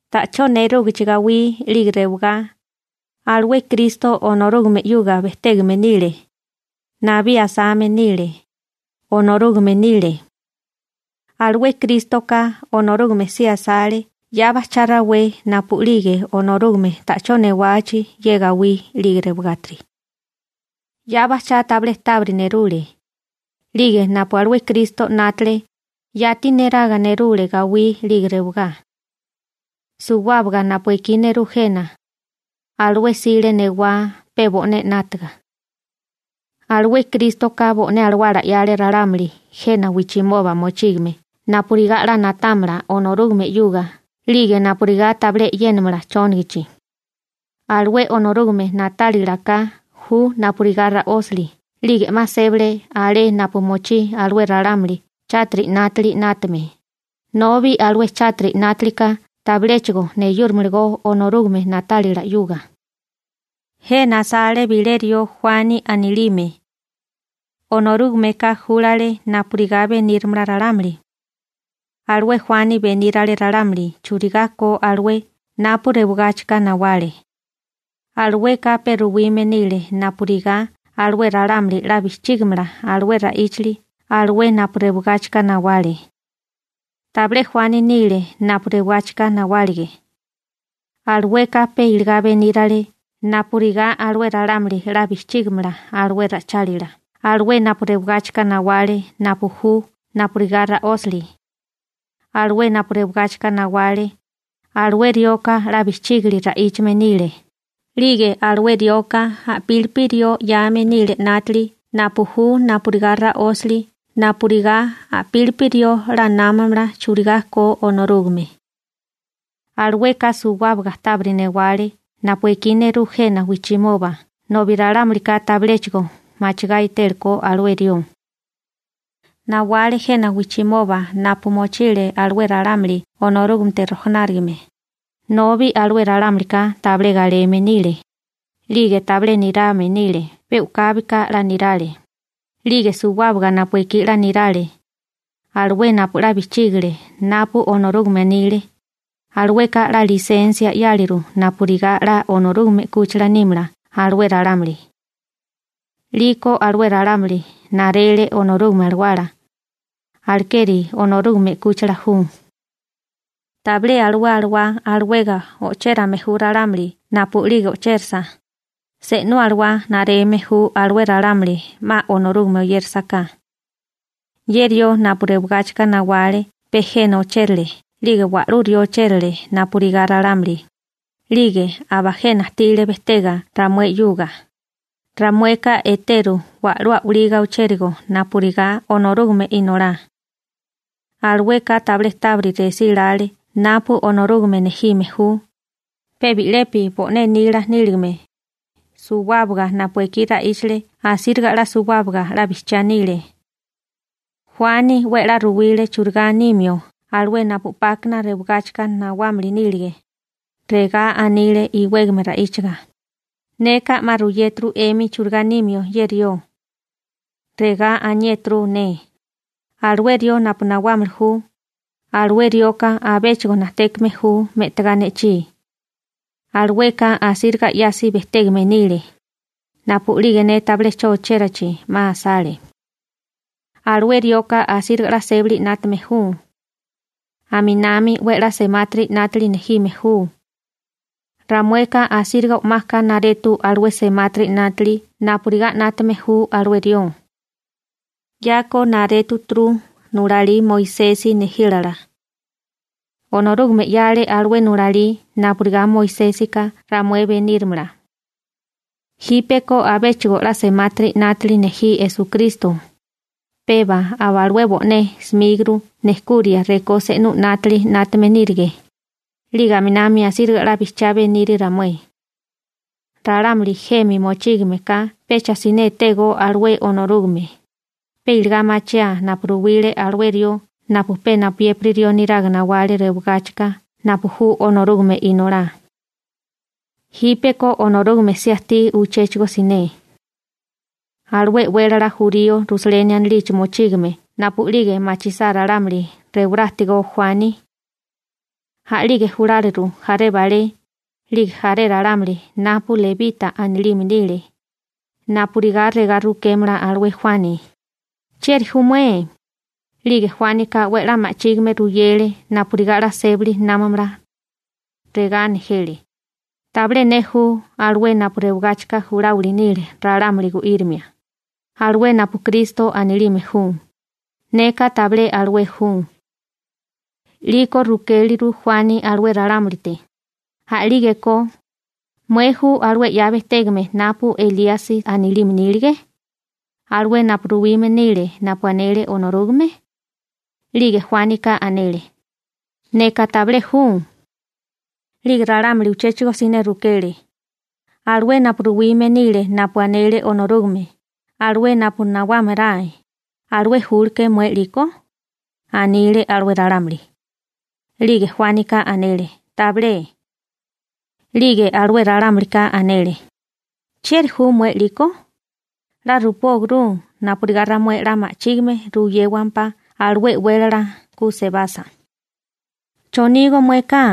Ta'chó nerúgichi gawí 'lige rewagá, alué Kristo Onorúgame 'yuga bejtégame nile. Nabí asame nile, Onorúgame nile. Alué Krístoka Onorúgame si asale 'ya bajchá rawé napu'lige Onorúgame ta'chó newachi ye gawí 'lige rewagátiri. 'Ya bajchá tabilé tábiri nerule, 'lige napu alué Kristo 'nátale, yati neraga nerule gawí 'lige rewagá. Suwábaga napu ekí nerú jena, alué 'sile newá pe bo'né 'nátaga. Alué Krístoka bo'né alawala 'yale ralámuli jena wijchimoba mochígame napurigá 'la na'támala Onorúgame 'yuga 'lige napurigá tabilé e'yénamala chónagachi. Alué Onorúgame na'tálilaká ju napurigá ra'ósali 'lige 'ma sébale alé napu mochí alué ralámuli chátiri 'nátili 'nátame, nobi alué chátiri 'nátaliká tabiléchigo neyúramalagó Onorúgame na'tálila 'yuga. Jena asale bilé rió Juani anilime. Onorúgameka júlale napurigá benírimala ralámuli. Alué Juani benírale ralámuli churigá ko alué napu rewigáchikana nawale. Alueka pe ruwime nile napurigá alué ralámuli 'la bijchígimala alué ra'íchali alué napu rewigáchika nawale. Tabilé Juani nile napu rewigáchika nawálige. Alueka pe iligá benírale napurigá alué ralámuli 'la bijchígimala alué ra'ichálila alué napu rewigáchika nawale napu ju napurigá ra'ósali. Alué napu rewigáchika nawale, alué rioka 'la bijchígili ra'íchame nile, 'lige alué rioka a'pílipi rió 'yame nile 'nátili napu ju napurigá ra'ósali napurigá a'pílipi rió 'la námamala churigá ko Onorúgame. Alueka suwábaga tábiri newale napu ekí nerú jena wijchimoba nobi ralámulika tabiléchigo machigá etélekó alué rió. Nawale jena wijchimoba napu mochile alué ralámuli Onorúgamete rojanárigame, nobi alué ralámulika tabilé galeme nile, 'lige tabilé nirame nile. Pe u'kábika 'la nirale, 'lige suwábaga napu ekí 'la nirale, alué napu 'la bijchígale napu Onorúgame anile, alueka 'la lisensia 'yáleru napurigá 'la Onorúgame 'kúchila nímala alué ralámuli. 'Liko alué ralámuli narele Onorúgame Alawala, alekeri Onorúgame 'kúchila ju. Tabilé alué alawá alawega o'chérame ju ralámuli napu'lige o'chérasa, se'nú alawá nareme ju alué ralámuli 'ma Onorúgame oyérasaká. Ye rió napu rewagáchika nawale pe jena ochérale 'lige wa'lú rió ochérale napurigá ralámuli, 'lige aba jena ajtile bejtega ramué 'yuga, ramueka eteru wa'lú a'waliga ochérigo napurigá Onorúgame Inolá. Alueka tabilé tábiri resílále napu Onorúgame nejime ju, pe bi'lepi bo'né nila níligame, suwábaga napu ekí ra'íchale asíriga 'la suwábaga 'la bijchiá nile. Juani 'we a'lá ruwile churigá nimio alué napu 'pákana rewagáchika nawámili nílige, regá anile iwégame ra'íchiga: ―Neka 'ma ruyéturu 'emi churigá nimio ye rió. Regá aniéturu ne: «Alué rió napu nawámili ju, alué rioka abéchigo najtékame ju me'tagá ne'chí. Alueka asíriga 'yasi bejtégame nile, napu'lige ne tabilé 'cho ochérachi 'ma asale.» Alué rioka asíriga 'la sébali 'nátame ju. Aminami 'we a'lá semátiri 'nátili nejime ju. Ramueka asíriga o'maka naretu alué semátiri 'nátili napurigá 'nátame ju alué rió. 'Yako narétuturu nulalí Moisesi nejílala. Onorúgame 'yale alué nulalí napurigá Moisésika ramué beníramala. Jípeko abéchigo 'la semátiri 'nátili nejí Esukristo, peba alué bo'né 'smíguru nejkuria rekó se'nú 'nátili 'nátame nírige, 'lige aminami asíriga 'la bijchiá beniri ramué. Ralámuli jemi mochígame ka pecha siné etégó alué Onorúgame, pe iligá machiaa napu ruwile alué rió napu pe napuyépiri rió neraga nawale rewagáchika napu ju Onorúgame Inolá. Jípeko Onorúgame si ajtí uchéchigo siné. Alué e'wélala jurío Rusaleni anilichi mochígame napu'lige machisá ralámuli rewará ajtigó Juani, a'lige juláliru jaré balé, 'lige jaré ralámuli napu lebita anilime nile, napurigá regá rukémala alué Juani: ―¿Chieri ju mué? 'Lige Juánika 'we a'lá ma'chígime ruyele napurigá 'la sébali námamala. Regá nejele: ―Tabilé ne ju alué napu rewigáchika juláwili nile ralámuli gu'írimia, alué napu Kristo anilime ju, neka tabilé alué ju. 'Liko rukéleru Juani alué ralámulite: ―A'lígeko, ¿mué ju alué 'ya bejtégame napu Elíasi anilime nílige, alué napu ruwime nile napu anele Onorúgame? 'Lige Juánika anele: ―Neka tabilé ju. 'Lige ralámuli uchéchigo siné rukele: ―¿Alué napu ruwime nile napu anele Onorúgame, alué napu nawámaráe, alué júleke'é mué 'liko? ―anile alué ralámuli. 'Lige Juánika anele: ―Tabilé. 'Lige alué ralámulika anele: ―¿Chieri ju mué 'liko? 'La rupóagurú napurigá ramué 'la ma'chígime ruyéwampá alué e'wélala ku sebasa. ¿Chonígó mueka?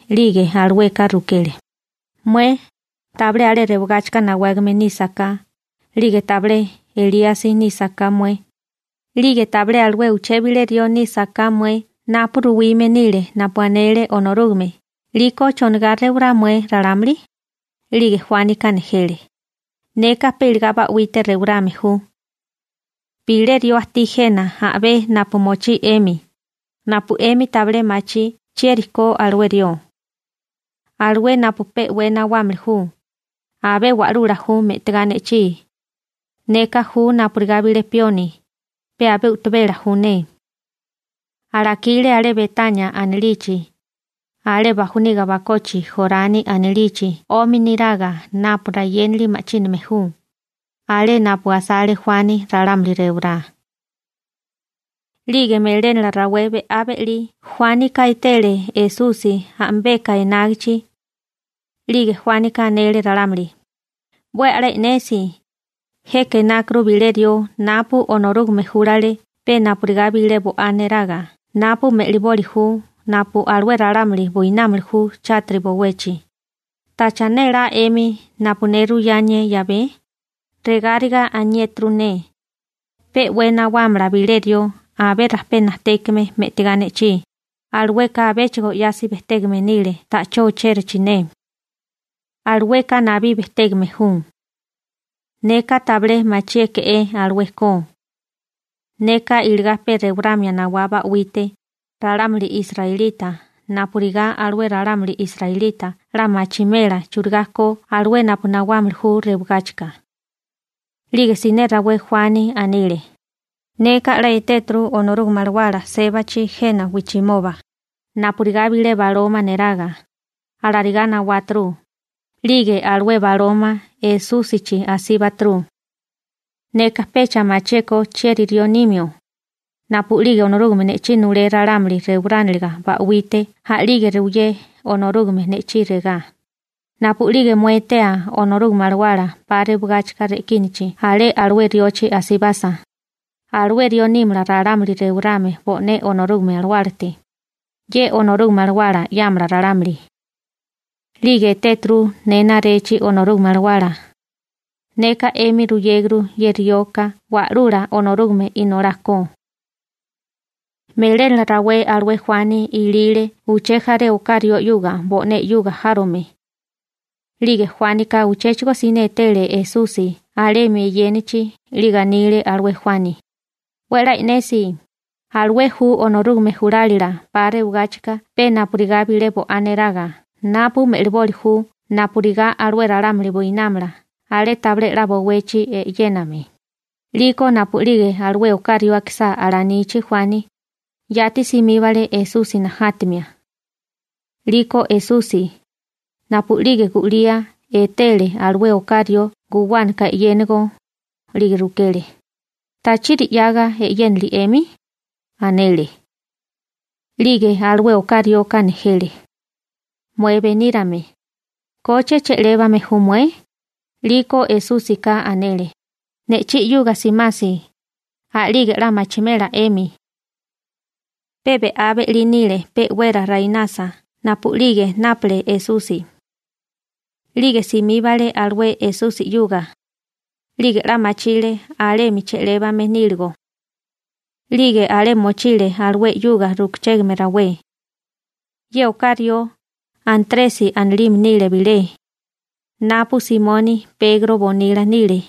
'lige alueka rukele: ―Mué tabilé alué rewagáchika nawágame nísaká, 'lige tabilé Elíasi nísaká mué, 'lige tabilé alué uché bilé rió nísaká mué napu ruwime nile napu anele Onorúgame, 'liko ¿chonigá rewará mué ralámuli? 'Lige Juánika nejele: ―Neka pe iligá ba'wite rewarame ju. Bilé rió ajtí jena a'bé napu mochí 'emi, napu 'emi tabilé machí chieri ko alué rió. Alué napu pe'wé nawámili ju, abé wa'lula ju me'tigá ne'chí. Neka ju napurigá bilé pioni, pe abé u'tabela ju ne. Alakile alé Betania anilichi, alé bajoniga bakochi Jorani anilichi 'omi niraga napu rayénali ma'chíname ju, alé napu asale Juani ralámuli rewará. 'Lige melénala rawé be'á be'lí Juánika etele Esusi a'mibeka enágichi. 'Lige Juánika anele ralámuli: ―¡'We a'lá e'nesi, jeka enákuru bilé rió napu Onorúgame júlale pe napurigá bilé bo'á neraga napu me'liboli ju napu alué ralámuli buinámili ju chátiri bowechi! ¿Tacha nélá 'emi napu ne ruyánié 'yabé? Regáriga aniéturu ne: «Pe 'we nawámala bilé rió abé rajpé najtékame me'tigá ne'chí. Alueka abéchigo 'yasi bejtégame nile ta'chó ochérichi ne. Alueka nabí bejtégame ju.» Neka tabilé machiéke'é alué ko. Neka iligá pe rewaramia nawá ba'wite ralámuli israelita napurigá alué ralámuli israelita 'la machimela churigá ko alué napu nawámili ju rewagáchika. 'Lige siné rawé Juani anile: ―Neka 'la etéturu Onorúgame Alawala sébachi jena wijchimoba, napurigá bilé baloma neraga, alarigá nawáturu, 'lige alué baloma Esúsichi asíbaturu. Neka pecha machié ko chieri rió nimio, napu'lige Onorúgame ne'chí nulé ralámuli rewarániliga ba'wite a'lige ruyé Onorúgame ne'chí regá: «Napu'lige mué etea Onorúgame Alawala 'pa rewigáchika re'kínichi alé alué riochi asibasa, alué rió nímala ralámuli rewarame bo'né Onorúgame Alawálate, ye Onorúgame Alawala 'yámala ralámuli.» 'Lige etéturu ne narechi Onorúgame Alawala, neka 'emi ruyéguru ye rioka Wa'lula Onorúgame Inolá ko. Melénala rawé alué Juani ilile uché jaré oká rió 'yuga bo'né 'yuga járome. 'Lige Juánika uchéchigo siné etele Esusi alemi eyénachi 'lige anile alué Juani: ―¡'We a'lá e'nesi, alué ju Onorúgame julálila 'pa rewigáchika pe napurigá bilé bo'á neraga napu me'liboli ju napurigá alué ralámuli buinámala alé tabilé 'la bowechi e'yéname! 'Liko napu'lige alué oká rió akisá alanichi Juani, yati simíbale Esusi najátamia. 'Liko Esusi, napu'lige gu'lía etele alué oká rió guwánaka e'yénigo, 'lige rukele: ―¿Tachiri 'yaga e'yénili 'emi? ―anele. 'Lige alué oká rioka nejele: ―Mué benírame, ¿koche che'lébame ju mué? 'Liko Esúsika anele: ―Ne'chí 'yuga simasi, a'lige 'la machimela 'emi. Pe be'á be'lí nile pe'wera rainasa napu'lige nápale Esusi. 'Lige simíbale alué Esusi 'yuga, 'lige 'la machile alemi che'lébame níligo. 'Lige alé mochile alué 'yuga rukachégame rawé. Ye oká rió, Antresi anilime nile bilé, napu Simoni Pegro bonila nile.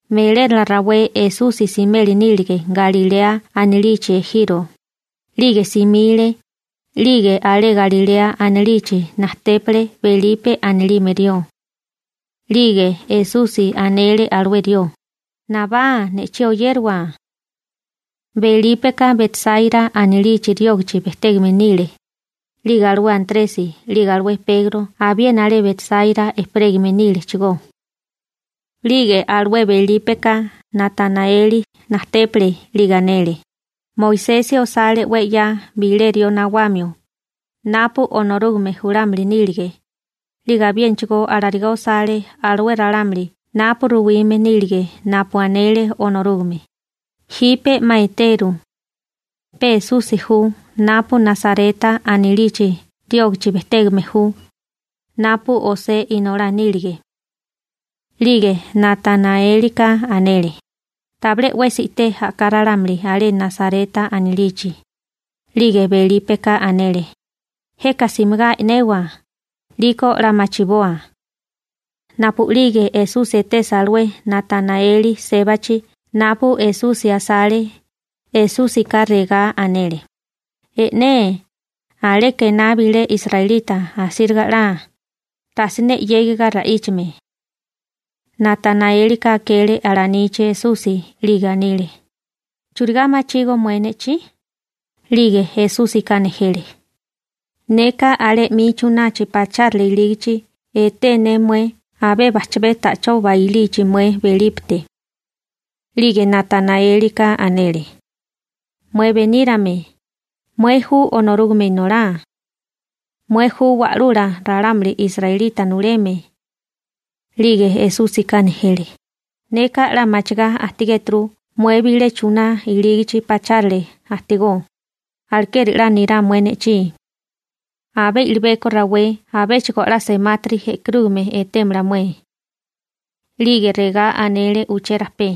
Melénala rawé Esusi simeli nílige Galilea anilichi ejiro, 'lige simile, 'lige alé Galilea anilichi najtépale Belipe anilime rió. 'Lige Esusi anele alué rió: ―Nabá. Ne'chí oyériwa. Belípeka Betsáira anilichi riógichi bejtégame nile, 'lige alué Antresi 'lige alué Pegro abiena alé Betsaira ejperégame nílechigó. 'Lige alué Belípeka Natanaeli najtépale, 'lige anele: ―Moisesi osale 'we 'ya bilé rió nawamio, napu Onorúgame julámili nílige, 'lige abiénachigó alarigá osale alué ralámuli napu ruwime nílige napu anele Onorúgame, jipe 'ma eteru. Pe Esusi ju napu Nasareta anilichi riógichi bejtégame ju, napu José inolá nílige. 'Lige Natanaélika anele: ―Tabilé 'wesi i'té a'ká ralámuli alé Nasareta anilichi. 'Lige Belípeka anele: ―Jeka simigá e'newa, 'liko 'la machiboa. Napu'lige Esusi etesa alué Natanaeli sébachi napu Esusi asale, Esúsika regá anele: ―E'né, aleka ená bilé israelita asíriga 'la, tasiné 'yégiga ra'íchame. Natanaélika akele alanichi Esusi 'lige anile: ―¿Churigá machígó mué ne'chí? 'Lige Esúsika nejele: ―Neka alé 'mi chunachi pachárale ilígichi eté ne mué abé bajchabé ta'chó bailichi mué Belípete. 'Lige Natanaélika anele: ―Mué benírame, mué ju Onorúgame Inolá. Mué ju Wa'lula ralámuli israelita nuleme. 'Lige Esúsika nejele: ―Neka 'la machigá ajtigéturu mué bilé chuná ilígichi pachárale ajtigó, alekeri 'la nirá mué ne'chí. Abé i'libeko rawé abéchigo 'la semátiri e'karúgame etémala mué. 'Lige regá anele uchérapé: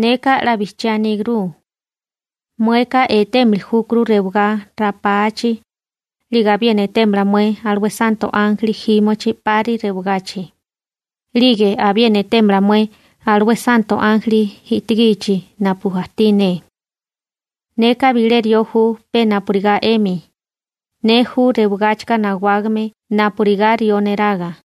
―Neka 'la bijchiá anígurú. Mueka etémili júkuru rewagá ra'pachi, 'lige abiena etémala mué alué santo ánjeli jímochi 'pari rewagachi, 'lige abiena etémala mué alué santo ánjeli e'tigichi napu ajtí ne. Neka bilé rió ju pe napurigá 'emi. Ne ju rewagáchika nawágame napurigá rió neraga.